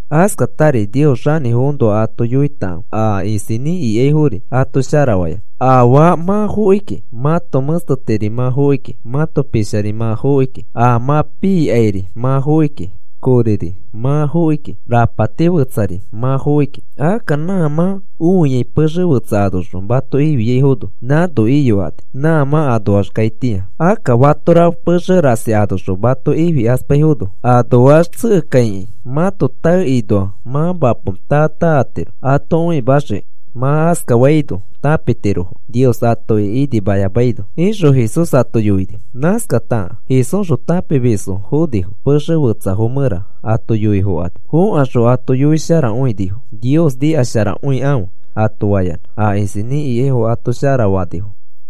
Askatari Nios xanĩfoõnoa ato yoitakãfe, a isinĩ ikaifori ato sharafayanã. Afaa mã fokiki, mãto mẽstetiri mã fokiki, mãto pishari mã fokiki, a mã piikairi mã fokiki, koriri mã fokiki, rapati fetsari mã fokiki. Akka nã mã õiai pexe fetsa anoxõ mato ifiaifono, nãno iyokani, nã mã anoax kaitĩa. Akka fatora pexe rasi anoxõ mato ifikaspaifono, anoax tsekekaikĩ mãto taekinoa mã mapo taa taa atiro ato õimaxiki. Mã askafaino tãpitirofo Nios atoki inimayamaino,” ixõ Jesús ato yoini. Nãskata Jesúsxõ tãpimisfo fonifo, pexe fetsafo mẽra ato yoifokani. Fokaxõ ato yoisharakõinifo. Nios nikasharakõikãfe ato fayanã a isinĩ ikaifo ato sharafanifo.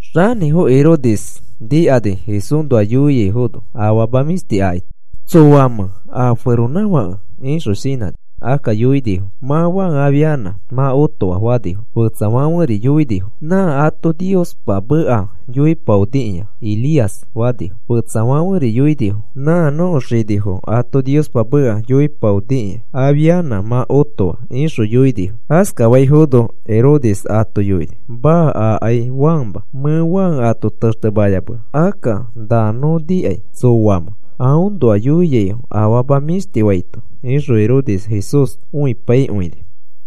Xanĩfo Herodes nikani Jesúsnoa yoiaifono afama mĩshti akaito. ¿Tsoamẽ a feronãfake? ixõ shinãni. Akka yoinifo: “Mã Juan afianã mã otoa,” fanifo. Fetsafãferi yoinifo: “Nã ato Niospa meka yoipaonikĩa Elías,” fanifo. Fetsafãferi yoinifo: “Nã nõko xinifo ato Niospa meka yoipaonikĩa afianã mã otoa,” ixõ yoinifo. Askafaifono Herodes ato yoini: “Maa, akai Juanma. Mẽ Juan ato textemayamea. Akka na nõ nikai tsoamẽ na aõnoa yoiaifo afama mĩshti faito,” ixõ Herodes Jesús õipaikõini.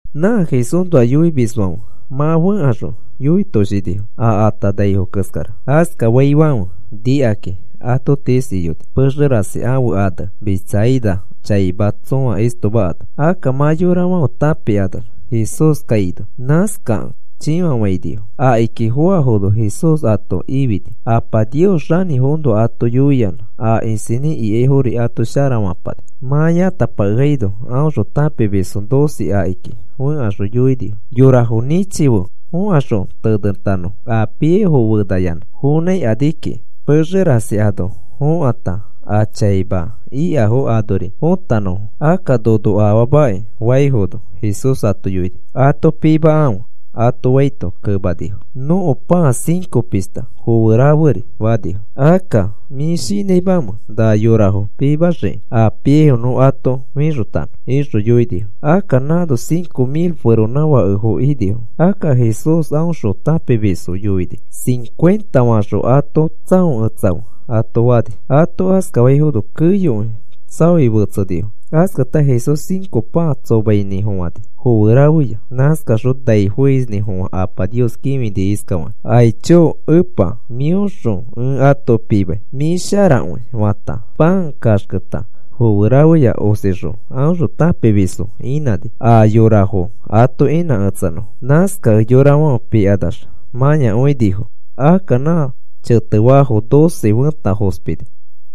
Nã Jesúsnoa yoimisfãfe mã fẽkaxõ yoitoshinifo a atanaifo keskara. Askafaifãfe nikakĩ ato tiis iyoni, pexe rasi ãfe ane Betsaida chaima tsõa istoma ano. Akka mã yorafãfe tãpikanax Jesús kaino, nãskakẽ chĩfafainifo. Akiki foafono Jesús ato ifini. Apa Nios xanĩfoõnoa ato yoiyanã a isinĩ ikaifori ato sharafapani. Mã yãtapakeaino, aõxõ tãpimisfo doce akiki fẽkaxõ yoinifo: “Yorafo nĩchife fokaxõ tenetanõfo a piaifo fenayanã fonãikani kiki, pexe rasi ano fokãta a chaima ikafo anori fotanõfo. Akka nono afaamaki,” faifono, Jesús ato yoini: “Ato pimakãfe,” ato faito kemanifo: “Nõko pãa cinco pishta foe raferi,” fanifo. “Akka, ¿mĩ shinãimẽ na yorafo pimaxiki a piaifo nõ ato fixotanõ?” ixõ yoinifo. Akka nãno cinco mil feronãfakefo inifo. Akka Jesús aõxõ tãpimisfo yoini: “Cincuenta faxõ ato tsãoketsakãfe,” ato fani. Ato askafaifono keyokõi tsaoi fetsenifo. Askata Jesús cinco pãa tsomainĩfofãni foe rafeya. Nãskaxõ nai foisnĩfofã Apa Nios kĩfini iskafakĩ: “Aicho Epa, mĩoxõ ẽ ato pimai. Mĩ sharakõi,” fata, pãa kaxketa foe rafeya osixõ aõxõ tãpimisfo inãni a yorafo ato inãketsanõfo. Nãskakẽ yorafãfe pikanax mãyakõinifo. Akka nã chete faafo doce fẽta fospini.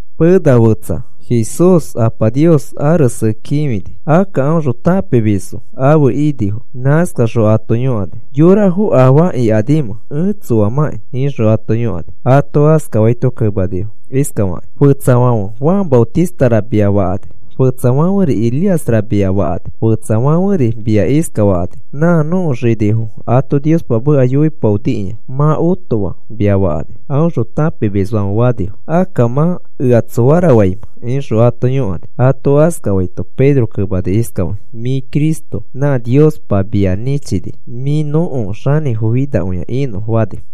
Pena fetsa Jesús Apa Nios arese kĩfini. Akka aõxõ tãpimisfo afe inifo. Nãskaxõ ato yõkani: “¿Yorafo afaa ikanimẽ ẽ tsoamãki?” ixõ ãto yõkani. Ato askafaito kemanifo iskafakakĩ: “Fetsafãfe Juan Maotistara, mia fakani. Fetsafãferi Elíasra mia fakani. Fetsafãferi mia iskafakani: ‘Nã nõko xinifo ato Niospa meka yoipaonikĩa mã otoa,’ mia fakani,” aõxõ tãpimisfãfe fanifo. “Akka mã, ¿ea tsoara faimẽ?” ixõ ato yõkani. Ato askafaito Pedro kemani iskafakĩ: “Mĩ Cristo nã Niospa mia nĩchini mĩ nõko Xanĩfo finakõia inõ,” fani.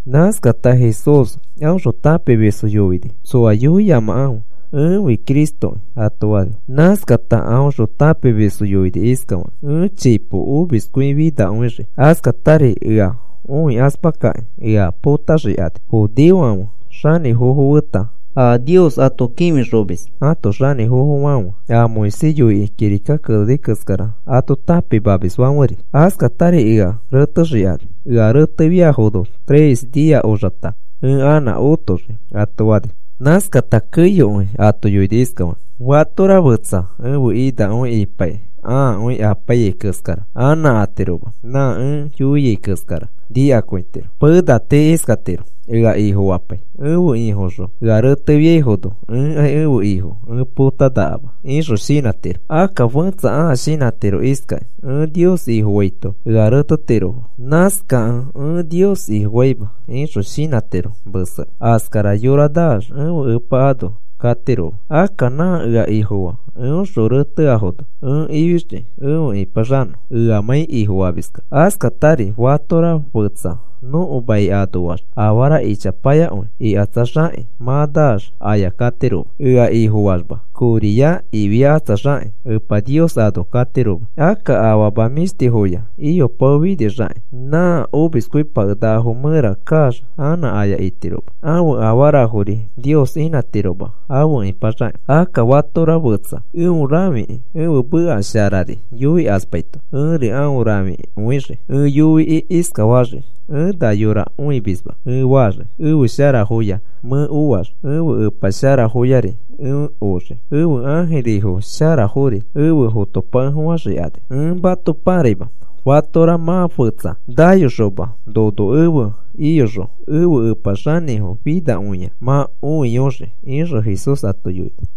Nãskata Jesús aõxõ tãpimisfo yoini: “Tsoa yoiyamakãfe ẽfi Cristoki,” ato fani. Nãskata aõxõ tãpimisfo yoini iskafakĩ: “Ẽ chipo omiskõifinakõixii. Askatari ea õikaspakakĩ ea potaxikani, judeofãfe xanĩfofo feta a Nios ato kĩfixomis ãto xanĩfofofãfe a Moisés yoikĩ kirika keneni keskara ato tãpimamisfãferi. Askatari ea retexikani. Ea retefiafono, tres nia oxata ẽ anã otoxii,” ato fani. Nãskata keyokõi ato yoini iskafaki: “Fatora fetsa ẽfe inakõi ipaikĩ ãakõi apaiyai keskara anã atiroma. Nã ẽ yoiai keskara nikakõitiro. Pena tii iskatiro, ea Ifofapai: ‘Ẽfe Ifoxõ ea retefiaifono ẽkai ẽfe Ifo ẽ potanakama,’ ixõ shinãtiro. Akka fẽtsa ãa shinãtiro iskakĩ: ‘Ẽ Nios Ifofaito ea retetirofo. Nãskakẽ ẽ Nios Ifofaima,’ ixõ shinãtiro mesekĩ. Askara yora naax ẽfe Epa ano katiroma. Akka nã ea Ifofaa, eõxõ reteafono ẽ ifixii efe ĩpaxanõ eamãi Ifofamiskẽ. Askatari fatora fetsa nõko mai anoax afara ichapayakõi ikatsaxakĩ mã naax aya katiroma. Ea Ifofayamax koriya ifiakatsaxakĩ Epa Nios ano katiroma. Akka afama mĩshtifoya iyopaofinixakĩ nã omiskõipakenakafo mẽra kaax anã aya itiroma. Ãfe afarafori Nios inãtiroma afe ipaxakĩ. Akka fatora fetsa eõ rãfikĩ ẽfe meka sharari yoikaspaito, ẽri aõ rãfikõixii ẽ yoikĩ iskafaxii: ‘Ẽ na yora õimisma,’ ẽ faxii. Ẽfe sharafoya mẽ oax ẽfe Epa sharafoyari ẽ oxii, ẽfe ãjiri sharafori efe fotopakefofãxikani. Ẽ mato pãraima, fatora mã fetsa nayoxoma nono efe iyoxõ ẽfe Epa xanĩfo finakõia mã õiyoxii,” ixõ Jesús ato yoini.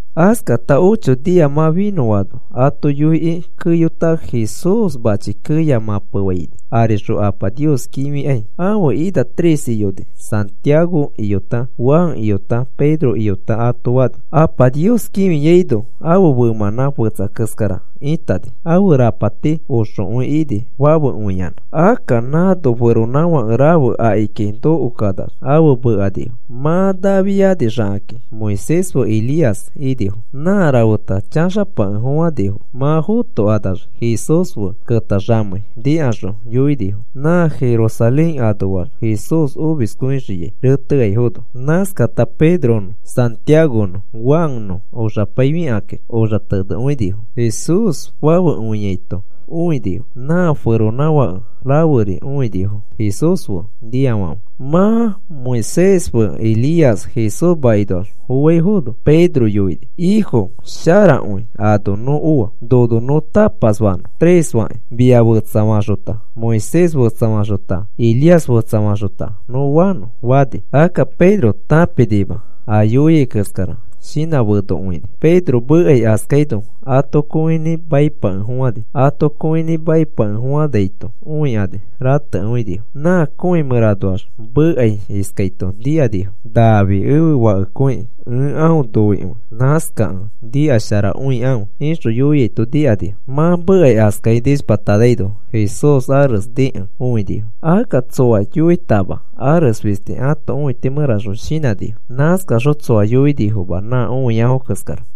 Askata ocho nia mã finõano ato yoikĩ keyota, Jesús mãchi keya mãpefaini arixõ Apa Nios kĩfikai. Ãfe ina tres iyoni. Santiago iyota Juan iyota Pedro iyota ato fani. Apa Nios kĩfiaino, ãfe femãnã fetsa keskara ĩtani. Ãfe rapati oxokõi ini fafekõiyanã. Akka nãno feronãfake rafe akiki nokokanax afe mekanifo. Mã nafianixakĩ Moisés fe Elías inifo. Nã rafeta chaxapakefofãnifo. Mã fotokanax Jesús fe ketaxamei nikaxõ yoinifo nã Jerusalén anoax Jesús omiskõixiai reteaifono. Nãskata Pedronõ Santiagonõ Juannõ oxapaifikakĩ oxatenekõinifo. Jesús fafekõiaito õinifo nã feronãfake raferi õinifo Jesús fe niafãfe. Mã Moisés fe Elías Jesús makinoax foaifono, Pedro yoini: “Ifo, sharakõi ano nõ oa. Nono nõ tapas fanõ, tres fakĩ. Mia fetsafaxota Moisés fetsafaxota Elías fetsafaxota nõ fanõ,” fani. Akka Pedro tãpinima a yoiai keskara shinãfenokõini. Pedro mekai askaino ato kõinĩ maipakefofãni. Ato kõinĩ maipakefofãnaito õikani ratekõinifo. Nã kõi mẽranoax mekai iskaito nikanifo: “Nafi ẽfe Fakekõikĩ ẽ aõ noikõi. Nãskakẽ nikasharakõikãfe,” ixõ yoiaito nikanifo. Mã mekai askai nishpatanaino, Jesús ares nikẽ õinifo. Akka tsoa yoitama ares fisti ãto õiti mẽraxõ shinãnifo. Nãskaxõ tsoa yoinifoma nã õiafo keskara.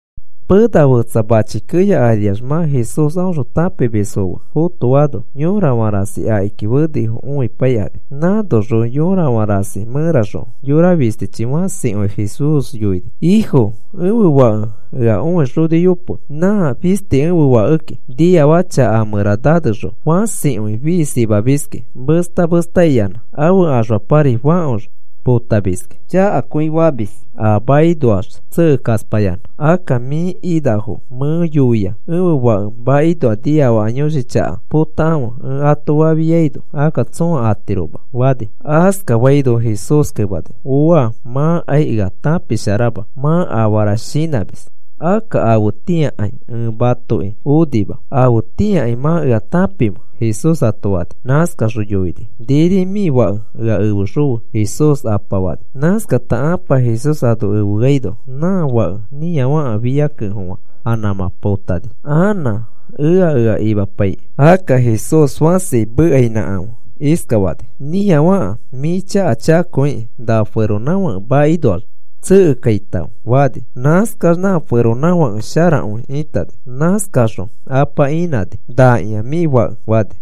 Pena fetsa mãchi keya ariax mã Jesús aõxõ tãpimisfo fe fotoano, yõrafã rasi akiki fenifo õipaikani. Nãnoxõ yõrafã rasi mẽraxõ yora fistichi fãsikõi Jesús yoini: “Ifo, ẽfe fake ea õixoniyope. Nã fisti ẽfe fakeki. Niafaka chaka a mẽra nanexõ, fãsikõi fiisimamiski, mesta mesta imayanã ãfe axfapari fãkox potamamiski. Chakakõi famis a makinoax tsekekaspayanã. Akka mĩ inafo mẽ yoia ẽfe fake makinoa niafaka yõshi chaka potakãfe ẽ ato fafiaino akka tsõa atiroma,” fani. Askafaino Jesús kemani: “¡Ooa! Mãkai ea tãpisharama. Mã afara shinãmis. Akka afetĩakai ẽ matoki onima. ¿Afetĩakai mã ea tãpimẽ?” Jesús ato fani. Nãskaxõ yoini: “Niri mĩ fake ea efexõfe,” Jesús apa fani. Nãskata ãpa Jesús ano efeaino, nã fake nĩafaka fia kekẽfofã anã nãmã potani, anã ea ea imapaikĩ. Akka Jesús fãsi mekainãkafã iskafani: “Nĩafaka mĩ chaka chakakõikĩ, nã feronãfake makinoax tsekekaitãfe,” fani. Nãskax nã feronãfake sharakõi ĩtani. Nãskaxõ apa ĩnãni. “Nakĩa mĩ fake,” fani.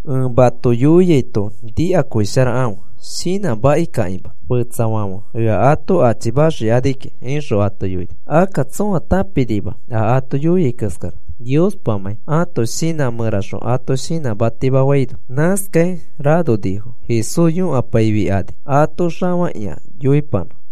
“Ẽ mato yoiaito nikakõisharakãfe, shinãmakikãkĩma. Fetsafãfe ea ato achimaxikani kiki,” ixõ ato yoini. Akka tsõa tãpinima a ato yoiai keskara Niospamãi ato shinã mẽraxõ ato shinãtima faino. Nãskai ranonifo Jesús yõkapaikani ato xafakĩa yoipanã.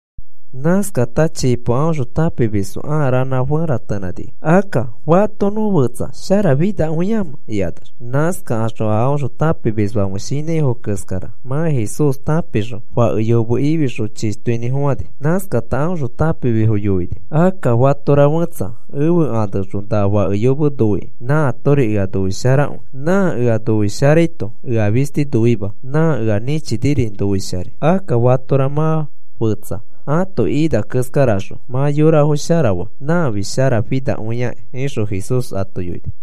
Nãskata chipo aõxõ tãpimisfo ãa ranã feratenãnifo, “Akka, ¿fato nõ fetsa sharafinakõimẽ?” ikanax. Nãskaxõ a aõxõ tãpimisfãfe shinãifo keskara mã Jesús tãpixõ fake yome ifixõ chishtoinĩfofãni. Nãskata aõxõ tãpimisfo yoini: “Akka fatora fẽtsa ẽfe aneõxõ na fake yome noikĩ nãatori ea noisharakõi. Nã ea noisharaito ea fisti noima, nã ea nĩchiniri noisharai. Akka fatora mã fetsa ãto ina keskaraxõ mã yorafo shara faa, nãfi sharafinakõiakĩ,” ixõ Jesús ato yoini.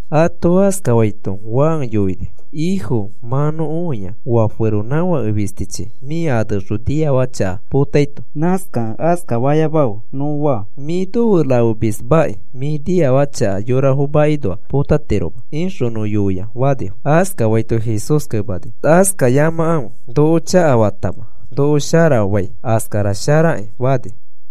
Ato askafaito Juan yoini: “Ifo, mã nõ õia oa feronãfake fistichi mĩ aneõxõ niafaka chaka potaito. Nãskakẽ, ‘Askafayamafe,’ nõ faa. ‘Mĩ nofe rafemismaki mĩ niafaka chaka yorafo makinoa potatiroma,’ ixõ nõ yoia,” fani. Askafaito Jesús kemani: “Askafayamakãfe, noko chakafatama, noko sharafai askara sharaki,” fani.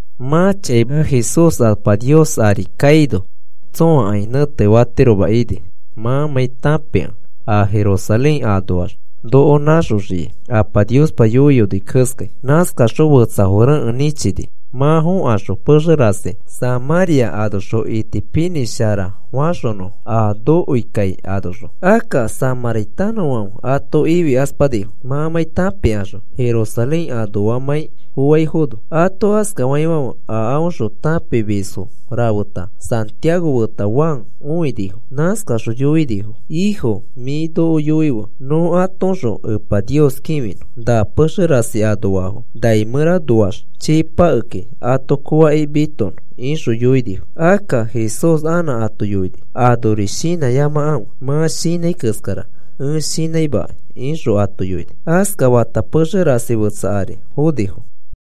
Mã chaima Jesús Apa Nios ari nai mẽra kaino tsõakai nẽtefatiroma ini mãmãi tãpikẽ a Jerusalén anoax noko nãxoxiai Apa Niospa yoiyoni keskai. Nãskaxõ fetsafo rekẽ nĩchini, mã fokaxõ pexe rasi Samãria anoxõ itipinĩsharafaxonõfo a nokoikai anoxõ. Akka samãritanõfãfe ato ifikaspanifo, mãmãi tãpikaxõ Jerusalén anoamãi foaifono. Ato askafaifãfe a aõxõ tãpimisfo rafeta Santiago feta Juan õinifo. Nãskaxõ yoinifo: “Ifo, mĩ noko yoife nõ atoõxõ Epa Nios kĩfinõ na pexe rasi anoafo nai mẽranoax chii pakeki ato kooakĩ mitonõ,” ixõ yoinifo. Akka Jesús anã ato yoini: “Anori shinãyamakãfe. Mã shinãi keskara ẽ shinãimakai,” ixõ ato yoini. Askafata pexe rasi fetsa ari fonifo.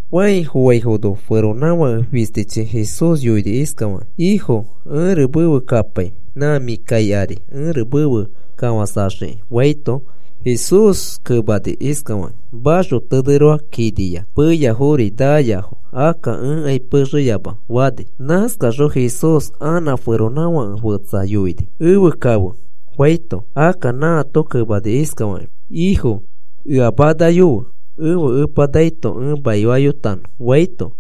Fãi foaifono feronãfake fistichi Jesús yoini iskafakĩ: “Ifo, ẽri mefe kapai nã mĩ kai ari ẽri mefe kafãsaxiki,” faito, Jesús kemani iskafakĩ: “Maxoteneroa kiniya, peyafori naayafo. Akka ẽkai pexeyama,” fani. Nãskaxõ Jesús anã feronãfake fetsa yoini: “Efe kafe,” faito, akka nãato kemani iskafakĩ: “Ifo, ea manayofe ẽfe epa naito ẽ maifayotanõ,” faito,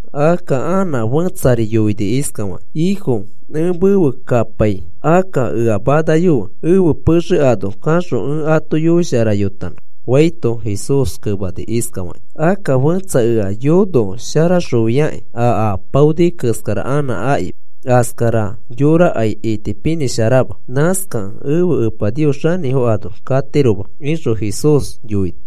Akka anã fẽtsari yoini iskafakĩ: “Ifo, ẽ mefe kapai, akka ea manayofe ẽfe pexe ano kaxõ ẽ ato yoisharayotanõ,” faito, Jesús kemani iskafakĩ: “Akka fẽtsa ea yonosharaxofiakĩ a apaoni keskara anã aki, askara yorakai itipinĩsharama. Nãskakẽ ẽfe Epa Nios xanĩfo ano katiroma,” ixõ Jesús yoini.